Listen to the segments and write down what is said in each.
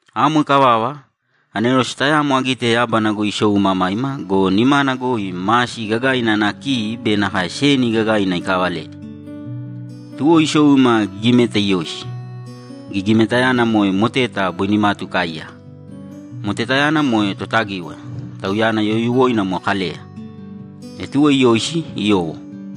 Amo ikavava, anerose tayamo agite yábana goi isou imamaima go, nimana goi masi gagaina ana ki be nakae seni gagaina ikaavaledi. Tuwo isou ima gigimeta iyoisi; gigimetayana moe moteta boi nimatu ikaaiyaka. Motetayana moe Totagíwaya, tauyana youyuwoina moe Kaleya. E tuwo iyoisi, iyowo.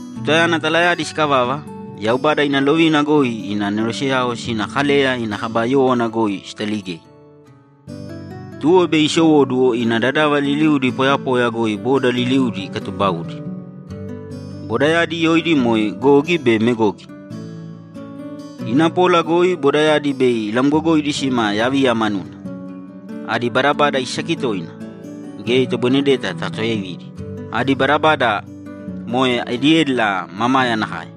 Tutayana talayadi sikavava, Yaubada ina lovina goi ina aneroseyao sina Kaleya ina kaba yówana goi sitaligei. Tuwo bei isowóduwo ina dadava liliuudi poyapoya goi boda liliudi ikatubaudi; bodayadi yoidi moe Gogi be Megogi. Ina pola goi bodayadi bei ilamgogoidi sima yaviya manuna. Adi badabada isaki toina; geya itoboinedeta takatuyaividi. Adi badabada moe ediédila mamaya nakae.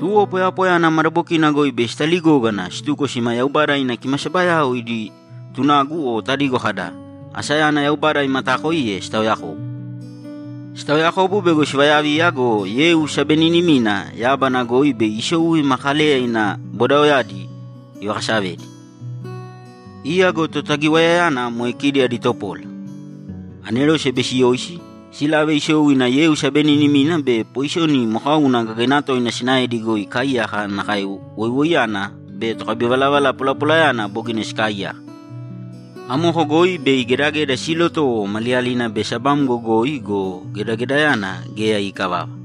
Tuwo poyapoya ana madabokina goi bei sitaligógana situko sima Yaubada ina kimasabayao idi tunagu o tadigo kada, ‘Asayana Yaubada imataakoiye’ sitaoyakobu. Sitaoyakobu bego sivayaviya go, yeu sabeninimina yábana goi bei isou ima Kaleya ina bodaoyadi ivakasavedi. Iya go Totagiwayayana moe kidi adi topola, anerose bei siyoisi, silave isou ina yeu sabeninimina be poiseni mokauna gagaina toina sinaedi goi ikaaiyaka nakae woiwoiyana be tokabivalavala polapolayana bogina sikaaiyaka. Amoko goi bei gedageda siilotowo maliyalina be sabamgo goi go, gedagedayana geya iikavava.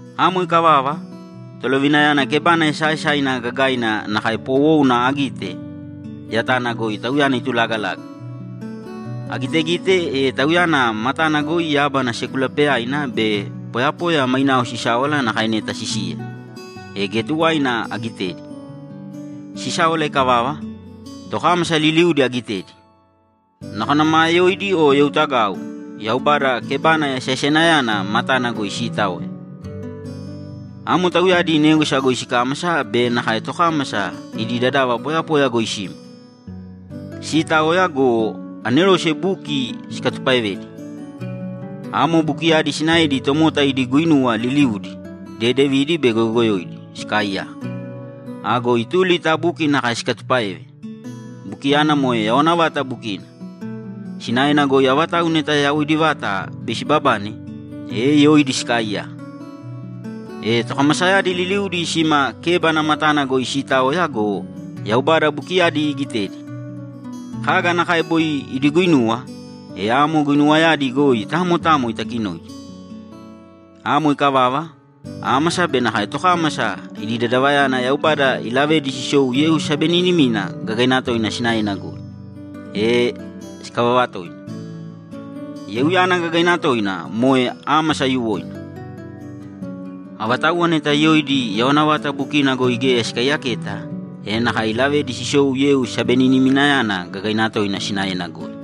Amo ikavava, Tolovinayana kebana esaaesaina gagaina nakae poowouna agite, yatana goi Tauyana itulagalaga. Agitegite, e Tauyana matana goi yábana sekulapeyaina be poyapoya mainao sisáwala nakae neta sisiya, e geya tuwaina agitedi. Sisáwala ikavava, tokámasa liliudi agitedi, nakona maa yoidi o youtagau, Yaubada kebana esaesainayana matana goi siitaoya. Amo tauyadi négwasa goi sikámasa be nakae tokámasa idi dadava poyapoya goi sima. Siitaoya go, anerose buki sikatupaevedi. Amo bukiyadi sinaedi tomota idi guinuwa liliudi, dedevidi be goyogoyoidi, sikaaiyaka. Ago ituli ta buki nakae sikatupáeve, bukiyana moe yawana vata bukina, sinaena goi avatauwa neta yawoidi vata bei sibabane, e yoidi sikaaiyaka. E tokamasayadi liliudi sima kébana matana goi siitaoya go, Yaubada bukiyadi igitedi, kaga nakae boi idi guinuwa, e amo guinuwayadi goi tamo tamo itakinoidi. Amo ikavava, ámasa be nakae tokámasa idi dadavayana Yaubada ilavedi sisou yeu sabeninimina gagaina toina sinaena goi, e sikavava toina. Yeuyana gagaina toina moe ámasa aiyuwoina. Avatauwa neta yoidi yawana vata bukina goi geya sikaiyaketa, e nakae ilavedi sisou yeu sabeniniminayana gagaina toina sinaena goi.